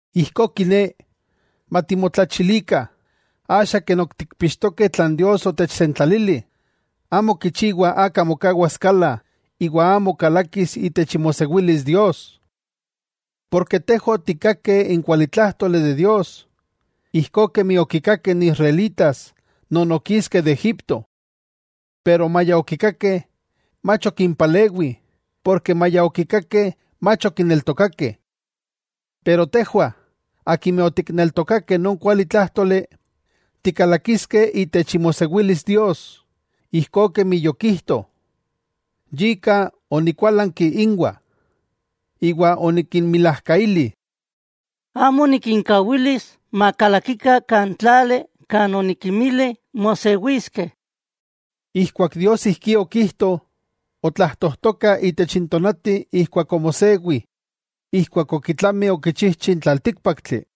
Ijkó kiné, matimotlachilikah, axa ken ok tikpixtokeh tlan Dios otechsentlalili, amo kichiwa aka mokawas kala iwa amo kalakis itech imosewilis Dios. Porke tejwah otikkakeh n kualitlájtoli de Dios, ijkó kemi okikakeh n Israelitas non okiskeh de Egipto. Pero maya okikakeh, mach okimpalewi, porke maya okikakeh mach okineltokakeh. Pero tejwah, akimeh otikneltokakeh non kuali tlájtoli, tikalakiskeh itech imosewilis Dios, ijkó kemi yokijto: Yika onikualanki inwah, iwa onikinmilajkaili: “Amo nikinkawilis makalakikah kan tlali kan onikinmili mosewiskeh.” Ijkuak Dios ijkí okijto, otlajtojtoka itech tonati ijkuak omosewi ijkuak okitlami okichijchi n tlaltíkpaktli.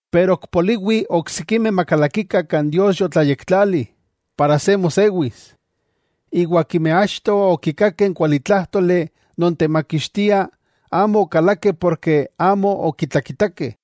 Pero ok poliwi oksikimeh makalakikah kan Dios yotlayektlali para se mosewis, iwa akimeh achto okikakeh n kualitlájtoli non temakixtia amo okalakeh porke amo okitlakitakeh.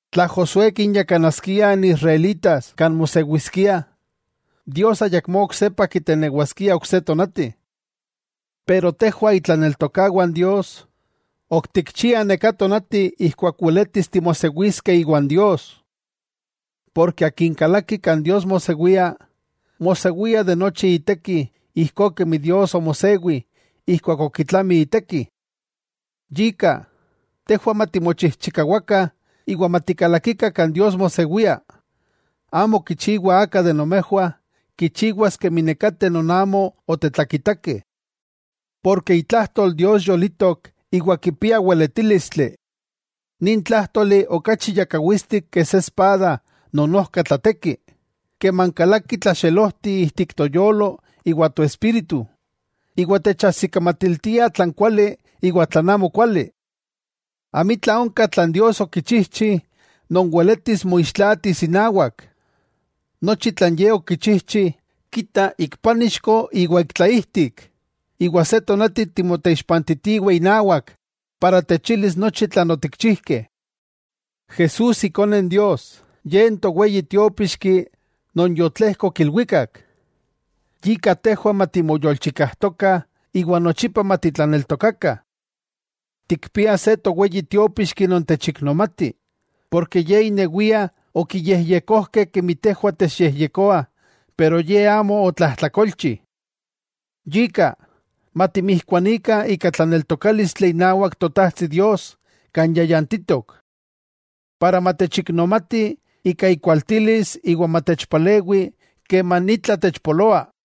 Tla Josué kinyakanaskia n Israelitas kan mosewiskiah, Dios ayakmó oksepa kitenewaskia ok se tonati. Pero, tejwah itlaneltokawah n Dios, ok tikchiah neka tonati ijkuak weletis timosewiskeh iwan Dios. Porke akin kalaki kan Dios mosewia, mosewia de nochi iteki ijkó kemi Dios omosewi ijkuak okitlami iteki. Yika, tejwah matimochijchikawakah iwa matikalakikah kan Dios mosewia, amo kichiwa aka de nomejwah kichiwas kemi nekateh non amo otetlakitakeh. Porke itlajtol Dios yolitok iwa kipia weletílistli. Nin tlájtoli okachi yakawitstik ke se espada non ojka tlateki, keman kalaki tlaxelojti ijtik toyolo iwa toespíritu, iwa techajsikamatiltia tlan kuali iwa tlan amo kuali. Amitla onka tlan Dios okichijchi non weletis moixtlaatis inawak, nochi tlan Ye okichijchi, kita ik pánixko iwa ik tlaijtik, iwa se tonati timoteixpantitiweh inawak iwa techilis nochi tlan otikchijkeh. Jesús Ikone Dios, Ye n Toweyi Tiópixki non yotlejkok ilwikak. Yika tejwah matimoyolchikajtokah iwa nochipa matitlaneltokakah. Tikpiah se Toweyi Tiópixki non techiknomati, porke Ye inewia okiyejyekojkeh kemi tejwah techyejyekoah pero Ye amo otlajtlakolchi. Yika, matimijkuanikah ika tlaneltokálistli inawak Totajtsi Dios kan yayantitok. Para matechiknomati ika ikualtilis iwa matechpalewi keman itla techpoloa.